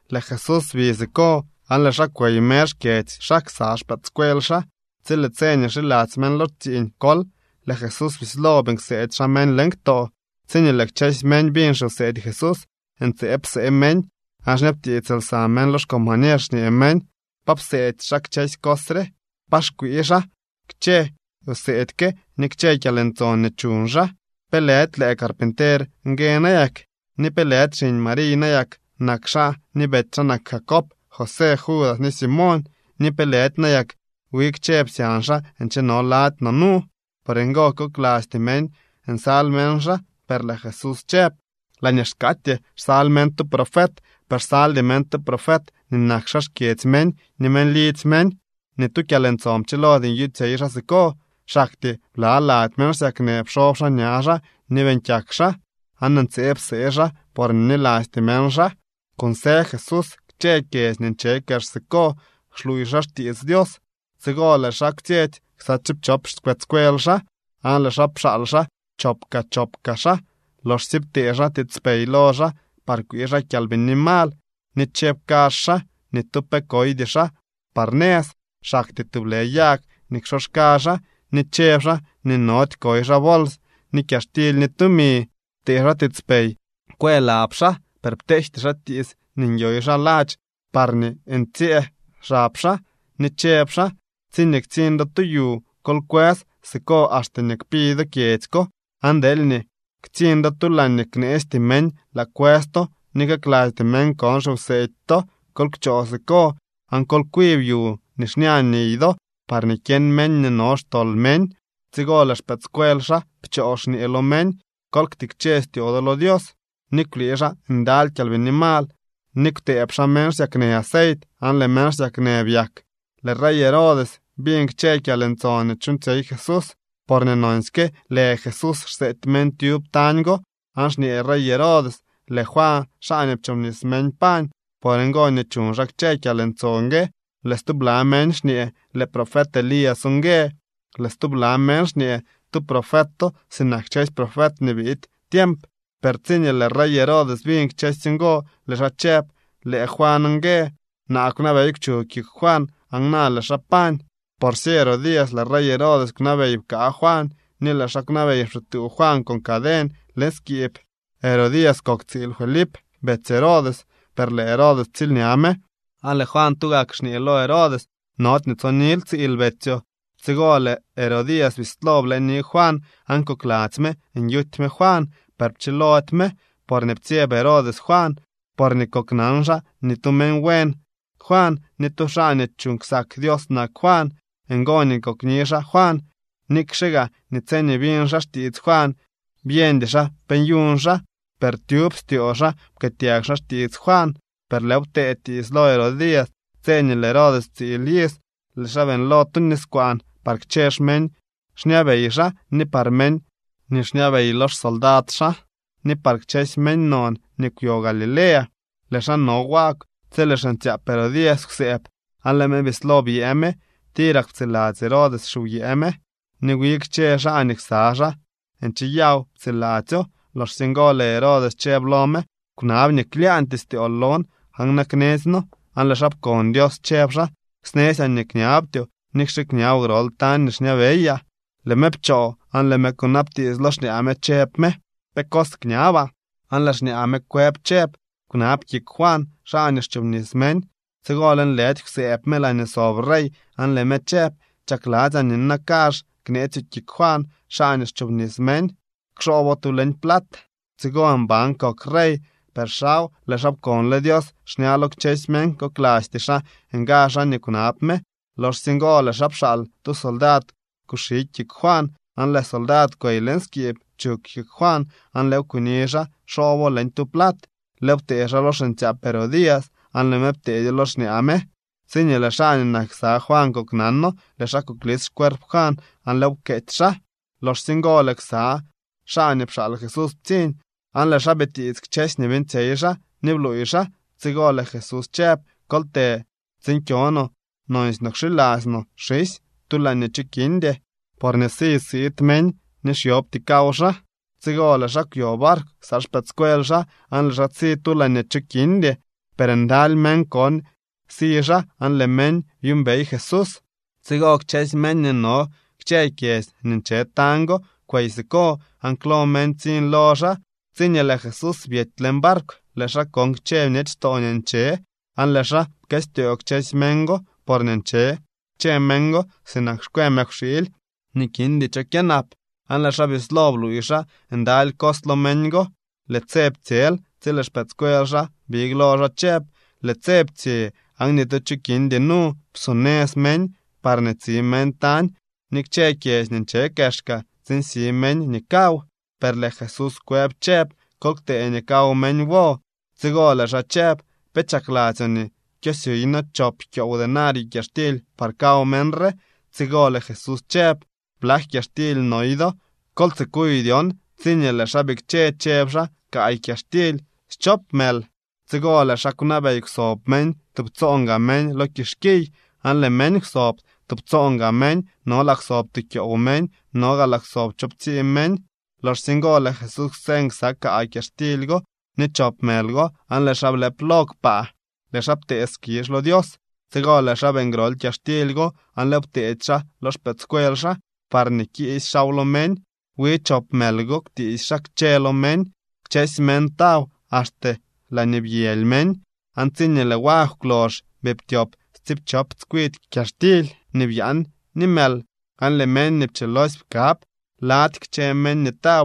Lëë Jesús bi siko aan lëë xaa kwey mer xkyedzy xaa ksa xpëëdscuel xaa. Tsi lëë tse nii xiladzy meñ lo tsiiñ kol, lëë Jesús bislo beeñ kseedy xaa meñ leñ ktoo. Tsiñee lëë kchësy meñ biñ xiwseedy Jesús, ntseeb psee meñ. Aan xñabtiits lsa meñ lo xcombañer xñee meñ: —¿Pa pseedy xaa kchësy cos re? ¿Pa xkwii xaa kchë wseedy ke ni kchë kyalntson nii chuñ xaa? ¿Pe lëdy lëë carpinter ngue nayak? ¿Ni pe lëdy xiñ Mariy nayak nak xaa ni betsy xaa nak Jacob, José, Judas ni Simoñ? ¿Ni pe lëdy nayak wi kchë psyañ xaa ncheno lady no nu? Por ngo koklasty meñ nsal meñ xaa. Per lëë Jesús chëb: —Laañee xkaatyee xsal meñ tu profet, per xsaldy meñ tu profet nii nak xaa xkyedzy meñ ni meñ lidzy meñ. Ni tu kyalntson pchilody nyuuñtsyey xaa siko, xaktyee bla lady meñ xsyaknë pxob xaa ña xaa ni beeñ kyak xaa. Aan ntseeb psee xaa porñee bnilasty meñ xaa. Kunsë Jesús kchë kyedzy nii nche kex siko xluuy xaa xtiits Dios. Tsigo lëë xaa kwtsyetsy ksa tsiipchop xpëëdscuel xaa aan lëë xaa pxaal xaa chop kaa chop kaa xaa loxsye ptee xaa tiitspey lo xaa par kwii xaa kyalbini mal. Ni chëb kazh xaa nii ni tu pe koydy xaa par nëz, xaktyee tublë yag nii ksoxka xaa. Ni chëb xaa nii nody koy xaa bols ni kyaxtily ni tumi. Ptee xaa tiitspey kwë lab xaa, per pteejty xaa tiits nii nyoy xaa ladx parñee ntsyëë xab xaa. Ni chëb xaa: —Tsiñee ktsiñ do tu yu, kol kwës siko axte nii kpi do kyedzy ko. Aan deelñee ktsiñ do tu laañee kneesty meñ laa kwës to ni kaklasty meñ kon xiwseedy to, kol kchoo siko aan kol kwib yu nii xña niy do parñee kyeñ meñ nii no xtol meñ. Tsigo lëë xpëëdscuel xaa pchoo xñee lo meñ: Kol ktikche styoo do lo Dios. Ni kwlii xaa ndaly kyalbini mal ni kwtëëb xaa meñ xsyaknë aceit aan lëë meñ xsyaknë byak. Lëë rey Herodes biñ kchë kyalntson nii chuuñtsyey Jesús, porñee nonsyke lë Jesús xseety meñ tyub tañ go. Aan xñee rey Herodes: —Lëë Juan, xaa nii pchoobnis meñ pañ. Por ngo nii chuñ xaa kchë kyalntson gue. Lëë stubla meñ xñee: —Lëë profet Elías ngue. Lëë stubla meñ xñee: —Tu profeto sinak kchësy profet nii biid tiemp. Per tsiñee lëë rey Herodes biñ kchësy ngo, lëë xaa chëb: —Lëë Juan ngue. Naa kwnabey kwchug kik Juan aan na lëë xaa pañ. Porsye Herodías lëë rey Herodes kwnabey pkaa Juan ni lëë xaa kwnabey pxituu Juan con caden leñ skiib. Herodías kok tsiil Felip, betsy Herodes, per lëë Herodes ptsiilña me. Aan lëë Juan tugak xñee lo Herodes: —Nody nii tsonil tsiil betsyoo. Tsigo lëë Herodías bislo blëëni Juan aan kokladzy me nyuty me Juan. Per pchilody me porñee ptsyeb Herodes Juan, porñee koknan xaa nii tu meñ buen Juan ni tu xaa nii chuuñ ksak Dios nak Juan. Ngo nii kokni xaa Juan. Nikxe gaa nii tsiñee biñ xaa xtiits Juan byeñdy xaa pe nyuñ xaa, per tyub styoo xaa pkëëtyag xaa xtiits Juan. Per lëëw ptee tiits lo Herodías tse nii lëë Herodes ptsiil iz. Lëë xaa beeñlo tu niskwaan par kchë xmeñ xñabey xaa ni par meñ nii xñabey lo xsoldad xaa ni par kchësy meñ non nii kwyo Galilea. Lëë xaa no wagw tsi lëë xiñtsyaap Herodías kwsëëb, aan lëë me bislo byëë me. Tirak ptsiladzy Herodes xiwyëë me ni wi kchë xaa nii ksa xaa ncheyaw ptsiladzyo. Loxsye ngo lëë Herodes chëb lo me: —Kwnab nii klyaañtyee styool lon aan na knetsyno. Aan lëë xaa pkon Dios chëb xaa: —Snetsyaa nii kñabtyoo, nikxe kñaboo grol tañ nii xñabeyaa. Lëë me pchoo aan lëë me kwnabtiits lo xñaa me chëb me: —¿Pe cos kñabaa? Aan lëë xñaa me kwëb chëb: —Kwnab kik Juan, xaa nii xchoobnis meñ. Tsigo lëënlëdy kwsëëb me laañee sob rey aan lëë me chëb: —Chakladzyaa nii nina kazh kneetsyoo kik Juan, xaa nii xchoobnis meñ. Kxoobo tu leñ plat. Tsigo mban kok rey. Per xaw lëë xaa pkonle Dios xña lo kchësy meñ, koklasty xaa nga xaa nii kwnab me. Loxsye ngo lëë xaa pxaal tu soldad kuxi kik Juan. Aan lëë soldad kwey leñ skiib, pchug kik Juan aan lëëw kuni xaa xoobo leñ tu plat. Lëëw ptee xaa lo xiñtsyaap Herodías aan lëë me pteedyo lo xñaa me. Tsiñee lëë xaa nii nak ksa Juan koknano, lëë xaa kuklis xcuerp Juan aan lëëw pkeetsy xaa. Loxsye ngo lëë ksa xaa nii pxaal Jesús ptsiñ aan lëë xaa bitiits kchësy nii beeñtsyey xaa ni bluuy xaa. Tsigo lëë Jesús chëb: —Kol të tsiin kyo no nonsy no kxiladzy no xisy tu laañee cho kindy. Porñee si siid meñ nii xyobty kaw xaa. Tsigo lëë xaa kwyo barkw ksa xpëëdscuel xaa aan lëë xaa si tu laañee cho kindy. Per ndaly meñ kon si xaa aan lëë meñ byuumbey Jesús. Tsigo kchësy meñ nii no kchë kyedzy nii nche tañ go kwey siko, aan klo meñ ptsiñ lo xaa. Tsiñee lëë Jesús byety leñ barkw, lëë xaa kon kchë bñechtoo nii nche, aan lëë xaa pkëstyoo kchësy meñ go porñee nche kchë meñ go sinak xkwe mëkwxiily nii kindy cho kyënap. Aan lëë xaa bislo bluuy xaa ndaly cos lo meñ go. Lëë tse ptsyel tsi lëë xpëëdscuel xaa big lo xaa chëb: —Lëë tse ptsye aan ni tu cho kindy nu. Psonëz meñ parñee tsi meñ tañ ni kchë kyedzy nii nche kexka tsiin si meñ nii kaw. Per lëë Jesús kwëb chëb: —Kol ktee nii kaw meñ wo. Tsigo lëë xaa chëb: —¿Pe chakladzyoo nii kyosyuuy noo chop kyoow denario kyaxtily par kaw meñ re? Tsigo lëë Jesús chëb: —¿Blak kyaxtily noy do? Kol tsikuy dyon. Tsiñee lëë xaa bikche chëb xaa: —Kaay kyaxtily schop mël. Tsigo lëë xaa kwnabey kwsob meñ tubtsoon gaa meñ lo kixkiy. Aan lëë meñ kwsob. Tubtsoon gaa meñ no laa kwsob tu kyoow meñ, no gaa laa kwsob choowptsii meñ. Loxsye ngo lëë Jesús kwseñ ksa kaay kyaxtily go ni chop mël go, aan lëë xaa blëp lo kpaa. Lëë xaa ptee skizh lo Dios. Tsigo lëë xaa beeñ grol kyaxtily go aan lëëw pteedy xaa lo xpëëdscuel xaa parñee kiisy xaaw lo meñ. Wi chop mël go kwtiisy xaa kchë lo meñ. Kchësy meñ taw axte laañee byëly meñ. Aan tsiñee lëë wagw kwlox, bii ptyop tsiipchop tskwidy kyaxtily nii byaan ni mël. Aan lëë meñ nii pchilosy pkab lady kchë meñ nii taw,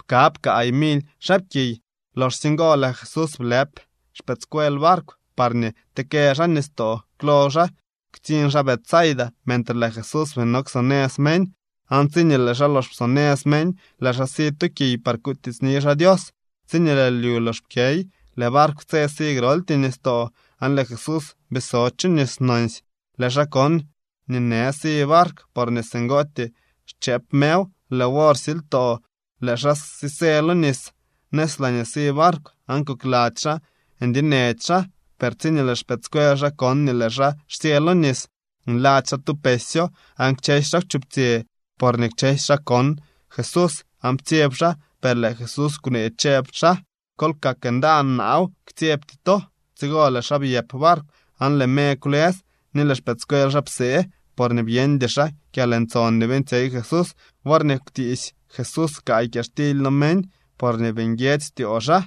pkab kaay mily xaapkiy. Loxsye ngo lëë Jesús blëp xpëëdscuel barkw parñee tekë xaa nistoo klo xaa, ktsiñ xaa Betsaida mentre lëë Jesús bii no ksonëz meñ. Aan tsiñee lëë xaa lox psonëz meñ, lëë xaa si tu kiy par kutiitsni xaa Dios. Tsiñee lëë lyu lox pkyey lëë barkw tse si groltyee nistoo. Aan lëë Jesús bii so chu nis nonsy. Lëë xaa kon nii në si barkw porñee singootyee xchëëp mew. Lëë wor silytoo lëë xaa sisë lo nis nëz laañee si barkw, aan kokladzy xaa ndyenech xaa. Per tsiñee lëë xpëëdscuel xaa kon nii lëë xaa xsyë lo nis, nladzy xaa tu pesyo. Aan kchësy xaa kwchuptsyë porñee kchësy xaa kon Jesús aan ptsyeb xaa. Per lëë Jesús kwnee chëb xaa: —¡Kol kak ndaan; naaw, ktsyebty to! Tsigo lëë xaa byëp barkw aan lëë me kwlës. Ni lëë xpëëdscuel xaa psee porñee byeñdy xaa kyalntson nii beeñtsyey Jesús worñee kwtiisy Jesús kaay kyaxtily lo meñ, porñee bii nguiedzy styoo xaa.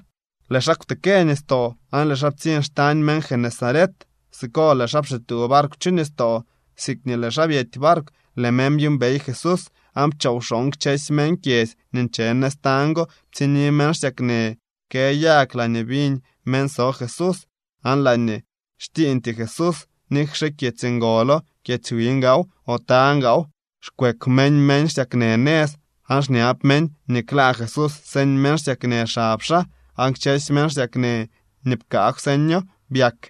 Lëë xaa kwtekë nistoo aan lëë xaa ptsiñ xtañ meñ Genesaret. Siko lëë xaa pxituu barkw chu nistoo. Siikñee lëë xaa byety barkw, lëë meñ byuumbey Jesús. Aan pchoo wxooñ kchësy meñ kyedzy nii nche nëz tañ go ptsiñni meñ xsyaknë kë yag laañee biñ meñ so Jesús. Aan laañee xtsiiñtyee Jesús, nikxe kyedzy ngolo, kyedzy wiñ gaaw, o tañ gaaw, xkweek meñ meñ xsyaknë nëz aan xñab meñ nii klaa Jesús señ meñ xsyaknë xab xaa. Aan kchësy meñ xsyaknë nii pkaa kwseño byak.